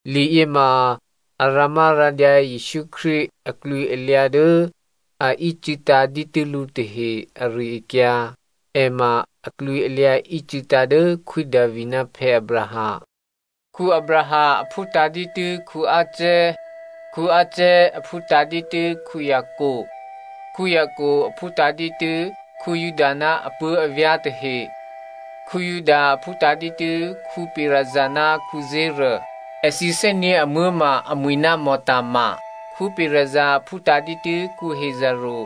Liyěma a rǎmárǎdyǎ Jesǔ Krístu aklwǐalyǎ dố a ícû̌tǎ̤ dǐtû́ lǔ tahe ari-akyǎ. È ma aklwǐalyǎ ícû̌tǎ̤ dố Khwí Davi ná Abraham. Abraham aphútǎ̤ dǐtû́ Isaac, Isaac aphútǎ̤ dǐtû́ Jacob, Jacob aphútǎ̤ dǐtû́ Juda ná apuố̤avyá̤ tahe. Juda aphútǎ̤ dǐtû́ Perez ná Zera, èthǐ thè́nyě̤ amuố̤ ma amwi̤ ná Tama. Perez aphútǎ̤ dǐtû́ Hezrò,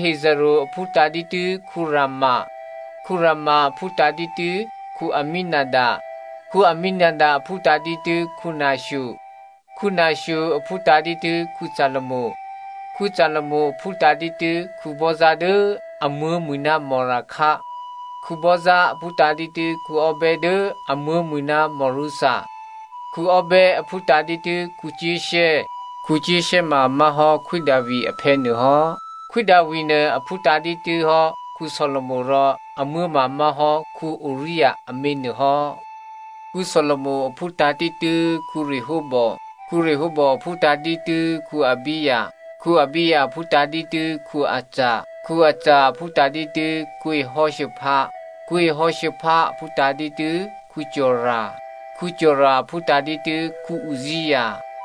Hezrò aphútǎ̤ dǐtû́ Ram, Ram aphútǎ̤ dǐtû́ Amminadab, Amminadab aphútǎ̤ dǐtû́ Nasho, Nasho aphútǎ̤ dǐtû́ Salmon, Salmon aphútǎ̤ dǐtû́ Boaz dố amuố̤ mwi̤ ná Raha, Boaz aphútǎ̤ dǐtû́ Obed dố amuố̤ mwi̤ ná Rutha, Obed aphútǎ̤ dǐtû́ Jesse. Jesse ma má̤hò́ Khwí Davi aphè̌ nuô hò́. Khwí Davi nuô aphútǎ̤ dǐtû́hò́ Solomo rò amuố̤ ma má̤hò́ Uria amě nuôhò́. Solomo aphútǎ̤ dǐtû́ Rehoboa, Rehoboa aphútǎ̤ dǐtû́ Abijah, Abijah aphútǎ̤ dǐtû́ Asa, Asa aphútǎ̤ dǐtû́ Jehoshapha, Jehoshapha aphútǎ̤ dǐtû́ Jora, Jora aphútǎ̤ dǐtû́ Uzzia,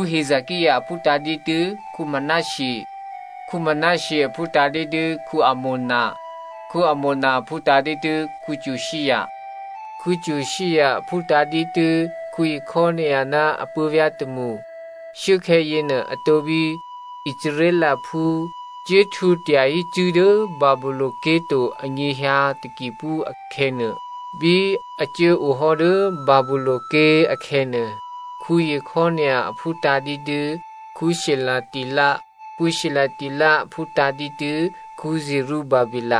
Hezekia aphútǎ̤ dǐtû́ Manasseh, Manasseh aphútǎ̤ dǐtû́ Amon, Amon aphútǎ̤ dǐtû́ Josia, Josia aphútǎ̤ dǐtû́ Jekonia ná apuố̤vyá̤ tômṳ. Shuốkhè̌ yěnuô atǒ bí Israelphú cuốhtwǒ tyahí cṳ̂́ dố Babylonia ké̤ to anyěhyǎ takiphú akhè̌nuô. Bí a cuố ohò́ dố Babylonia ké̤ akhè̌nuô, Jekonia aphútǎ̤ dǐtû́ Shealtiel, Shealtiel aphútǎ̤ dǐtû́ Zerubababe.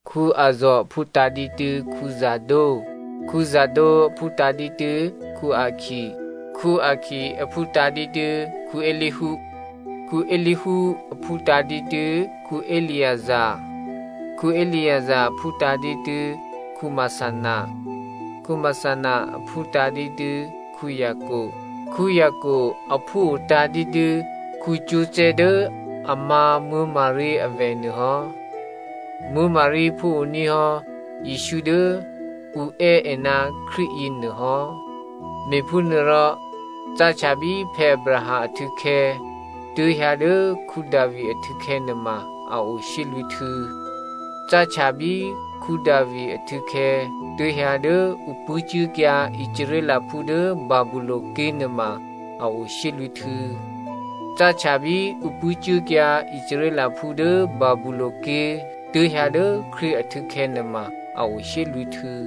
Azor aphútǎ̤ dǐtû́ Zadok, Zadok aphútǎ̤ dǐtû́ Akim, Akim aphútǎ̤ dǐtû́ Eliud, Eliud aphútǎ̤ dǐtû́ Eleazar, Eleazar aphútǎ̤ dǐtû́ Matha, Matha aphútǎ̤ dǐtû́ Jacob, Jacob aphúo tǎ̤dǐtû́ Joseph dố a má̤ Maria avè̤ nuôhò́. Maria phúoní̤ hò́ Jesǔ dố ǔ è́ è ná Krístu yěnuôhò́. Me̤phúnuôrò cáhtya bí Abraham ahtû̌khè̌ tuố̤hyǎ dố Davi ahtû̌khè̌ nuôma a o shyélwǐ̤htû̌. Cáhtya bí Davi ahtû̌khè̌ tuố̤hyǎ dố ǔ pṳ̂́cuốkyǎ Israelphú dố Babylonia ké̤ nuôma a o shyélwǐ̤htû̌. Cáhtya bí ǔ pṳ̂́cuốkyǎ Israelphú dố Babylonia ké̤ tuố̤hyǎ dố Krístu ahtû̌khè̌ nuôma a o shyélwǐ̤htû̌.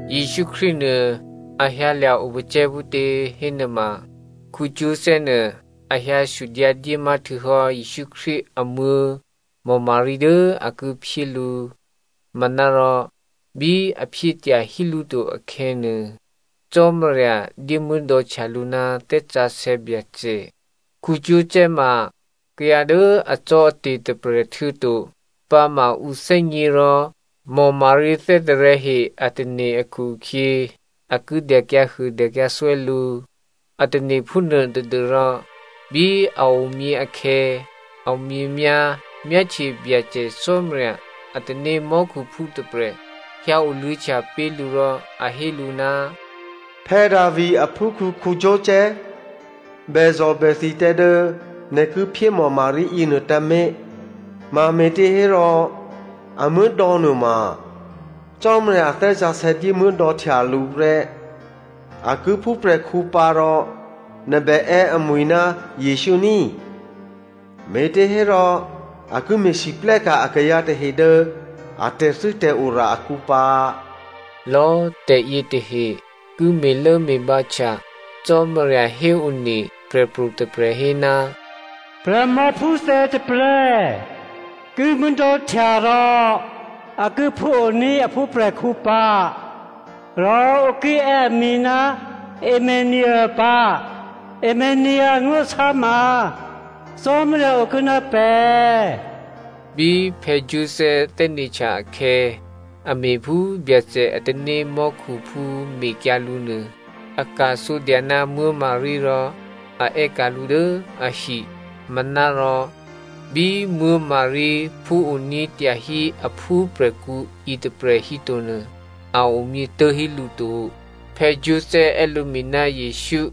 Jesǔ Krístu nuô a hyǎlya̤ opacè̤̌ phútě hénuôma, Joseph nuô a hyǎ sudyǎ dyémá htuô̌hò́ Jesǔ Krístu amuố̤ Maria dố a ki phyé lǔ. Manárò bí a phyé tyahí lǔ to akhè̌nuô, Cò́marya dyémuố̤dò̌htya lǔ ná Thè́ Sǎsè̌ Byacè. Joseph ma kayǎ dố acò́ate̤ tôprè̤ htuô̌to pǎma ǔ thè́gně rò Maria thè́tarè̤̌he a tane̤ akhu-akhyě a kíré̤ dyakyǎhuô dyakyǎthwè́ lǔ. A tane̤ phúnuô tadû́rò, bí a omyě akhè̌, a omyěmyá̤ myáhtye Byacè Cò́marya a tanémò́khuphú tôprè̤ hyǎoluô̌htya pé̤ lǔ rò a hé lǔ, “Davi aphúkhǔ Joseph, bèzò̤bèthi tǎ dố nè̤ ki phyé Maria yěnuô tǎmé̤, mame̤těhérò, a muố̤dò̌ nuôma Cò́marya a Thè́ Sǎsè̌ dyémuố̤dò̌htya lǔ prè́. A ki phúprè̤khǔ pǎ rò nè̤ bè è́ amwǐ̤ ná Jesǔ ní꤮, me̤těhérò a ki me̤lwóhteka̤ akayǎ tahe dố a tè̤thû́tè̤ora akǔ pǎ.” Lò̌꤮ tè̤yě tahe ki me̤lốme̤bǎhtya Cò́marya héone prè̤pro̤ tôprè̤ hé, “Prè̤mòphúthè tôprè̤ ki muố̤dò̌htya rò a ki phúoní̤ a phúprè̤khǔ pǎ, rò ǔ ki è́ amwi̤ ná Emmanuelè pǎ,” Emmanuelè angó̤lasá ma, “Cò́marya okuô̌ ná pè̤.” Bí Joseph thè́né̤htya akhè̌, a me̤phú Byacè a tanémò́khuphú mekyǎ lǔ nuô. A ka̤sǒdya ná Maria rò a è́ka̤ lǔ dố ahi. Manárò bí Maria phúoní̤ tyahí aphúprè̤khǔ yětôprè̤ hítonuô, a omyě tố̤hí lǔ to. Joseph è́ lǔmwi̤ ná Jesǔ.